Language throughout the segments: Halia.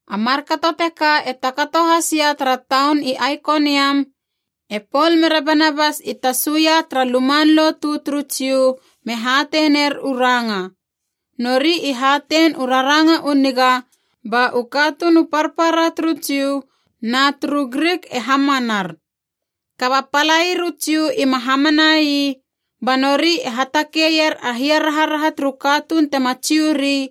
A markato teka e takato has ia tara taun i Aikoniam, e Pol mere Banabas i tasu ia tara luman lotu turu Jiu me hatei ner u ranga. Nori i hatein u raranga u niga ba u katuun u parpara turu Jiu na turu Grik e hamanar. Kaba palair u Jiu i ma hamana ii, ba nori e hatakeier a hiaraharaha turu katuun tema Jiu ri,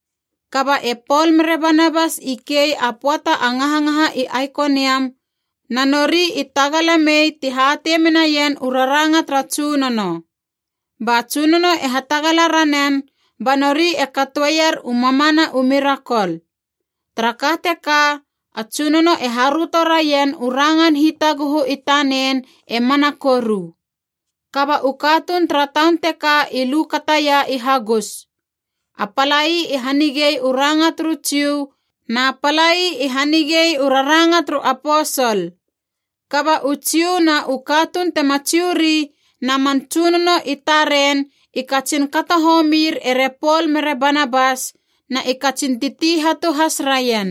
Kaba e Pol mere Banabas i kei a pöata a ngahangaha i Aikoniam, na nori i tagala mei ti hatei menaien u raranga tara Tsunono. Ba Tsunono e hatagala ranen ba nori e katoeier u mamana u mirakol. Tara ka teka, a Tsunono e haröto raien u rangan hitaguhu i tanen e mana koru. Kaba u katuun tara taun teka i lu kataia i hagus. A palai i hanigei u ranga turu Jiu, na palai i hanigei u raranga turu aposol. Kaba u Jiu na u katuun tema Jiu ri na man tsunono i taren i katsin kato homir ere Pol mere Banabas na i katsin titi hatu has raien.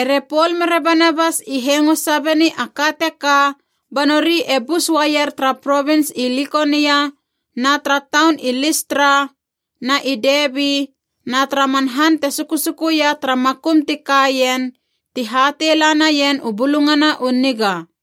Ere Pol mere Banabas i hengo sabeni a ka teka, ba nori e bus uaier tara provins i Likonia, na tara taun i Listra na i Debi, na tara man han te sukusukuia tara makum ti kaien, ti hatei la naien u Bulungana u Niga.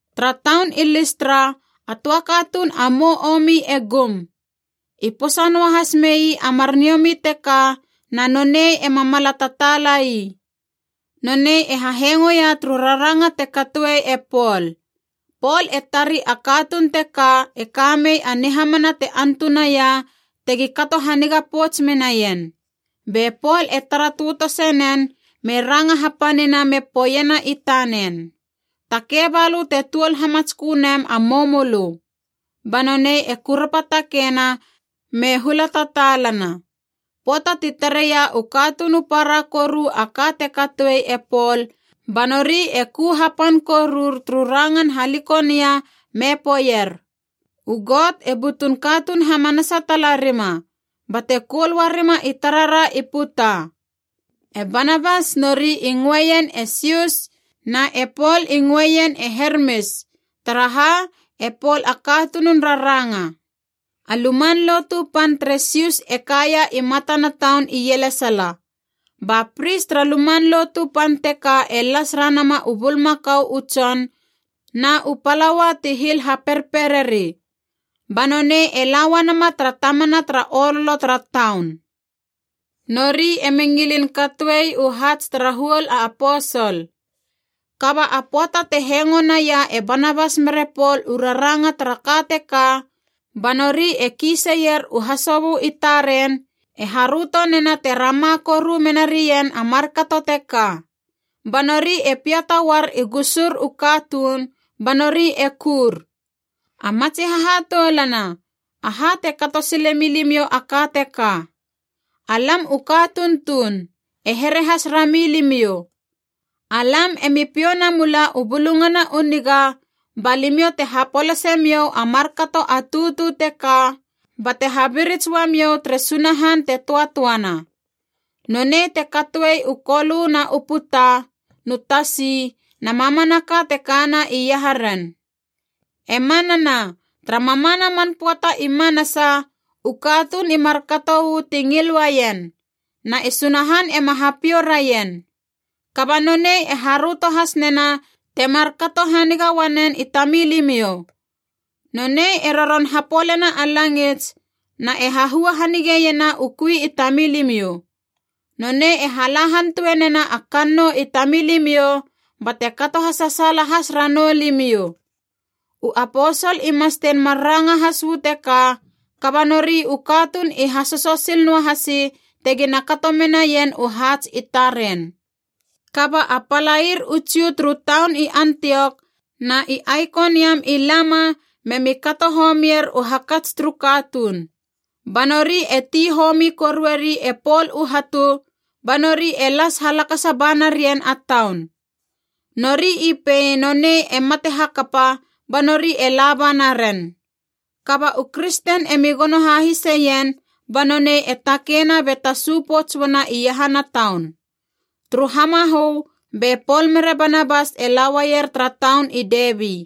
Tara taun i Listra a töa katuun a mou omi e gum. I posa noahas mei a mar niomi teka na nonei ema mala tataala ii. Nonei e hahengoia turu raranga te katoe e Pol. Pol e tari a katuun teka e kamei a nihamana te antunaia tegi kato haniga pouts menaien. Be Pol e tara tötose nen me ranga hapanina me poeiena i tanen, “Takei balö te tuol hamatskö nem a moumölö.” Ba nonei e kurapa takeina me hula tataalana. Pöata ti tareia u katuun u para koru a ka te katoi e Pol ba nori e ku hapan korur turu rangan HaLikonia me poeier, “U got e butun katuun hamanasa tala rima, bate koul uarima i tarara i puta!” E Banabas nori i ngöeien e Sius, na e Pol i ngöeien e Hermis, taraha e Pol a katunun raranga. A luman lotu pan tere Sius e kaia i matana taun ielesala. Ba pris tara luman lotu pan teka e las ranama u bulmakau u tson na u palaua ti hil haperpereri. Ba nonei e la uanama tara tamana tara ololo tara taun. Nori emi ngilin katoei u haats tara huol a aposol. Kaba a pöata te hengo naia e Banabas mere Pol u raranga tara ka teka, ba nori e kiiseier u hasobö i taren, e haröto nena te rama koru mena rien a markato teka. Ba nori e piata uar i gusur u katuun ba nori e kur, “A matsi hahatoulana, aha te kato sile milimiou a ka teka! Alam u katuun tuun, e here has rami limiou. Alam emi piou namula u Bulungana u Niga ba limiou te hapolase miou a markato a tutu teka, bate habirits uamiou tere Sunahan te töatöana. Nonei te katoe u kolö na u puta nu tasi, na mamanaka te kana iaharen. E manana, tara mamana man pöata i manasa u katuun i markato uu ti ngil uaien, na e Sunahan ema hapiou raien. Kaba nonei e haröto has nena temar kato haniga uanen i tamilimiou. Nonei e roron hapolena a langits, na e hahua hanigeiena u kui i tamilimiou. Nonei e hala hantue nena a kannou i tamilimiou bate kato hasasaala has ranou limiou.” U aposol i mastein mar ranga has uu teka kaba nori u katuun i hasoso sil noahasi tegina kato menaien u haats i taren. Kaba a palair u Jiu turu taun i Antiok na i Aikoniam i lama, memi kato homier u hakats turu katuun. Ba nori e ti homi korueri e Pol u hatu, ba nori e las halakasa ba narien a taun. Nori i pei nonei e mate hakapa, ba nori e laba naren. Kaba u kristen emi gono hahiseien, ba nonei e takeina be tasu pouts uana iahana taun. Turu hamahö be Pol mere Banabas e lauaier tara taun i Debi.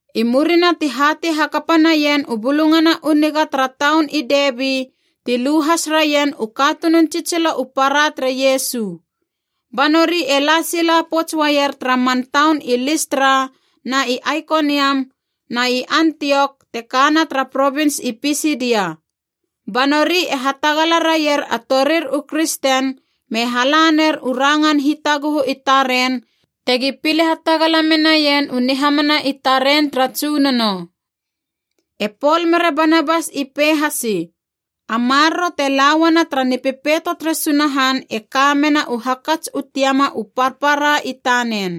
I murina ti hatei hakapa naien u Bulungana u Niga tara taun i Debi ti lu has raien u katunun tsitsilo u para tere Iesu. Ba nori e la sila pouts uaier tara man taun i Listra na i Aikoniam, na i Antiok te kana tara provins i Pisidia. Ba nori e hatagala raier a torir u kristen me hala ner u rangan hitaguhu i taren tegi pile hatagala menaien u nihamana i taren tara Tsunono. E Pol mere Barabas i pei hasi, a maroro te lauana tara Nipepeito tere Sunahan e ka mena u hakats u tiama u parpara i tanen.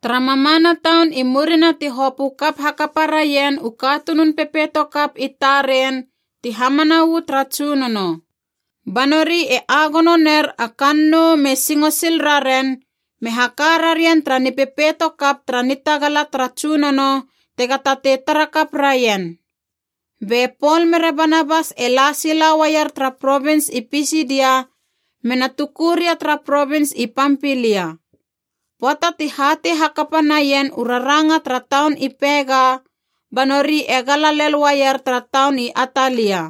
Tara mamana taun i murina ti hopö kap hakapa raien u katunun pepeito kap i taren ti hamana uu tara Tsunono. Ba nori e agono ner a kannou me singo sil raren, me haka rarien tara nipepeito kap tara nitagala tara Tsunono tega tatei tara kap raien. Be Pol mere Banabas e la sila uaier tara provins i Pisidia me na tuku ria tara provins i Pampilia. Pöata ti hatei hakapa naien u raranga tara taun i Pega, ba nori e gala lel uaier tara taun i Atalia.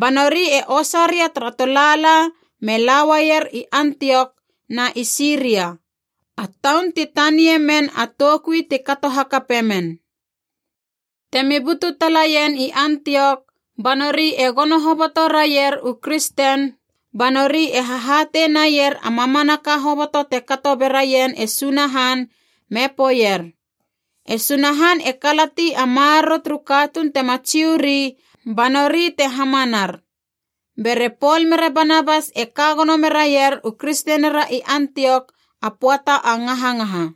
Ba nori e osa ria tara tolaala me lauaier i Antiok na i Siria, a taun ti tanie men a toukui ti kato hakape men. Temi butu talaien i Antiok ba nori e gono hoboto raier u kristen, ba nori e hahatei naier a mamanaka hoboto te kato be raien e Sunahan, me poeier, “E Sunahan e kalati a maroro turu katuun tema Jiu ri, ba nori te hamanar.” Bere Pol mere Banabas e ka gono meraier u kristenira i Antiok a pöata a ngahangaha.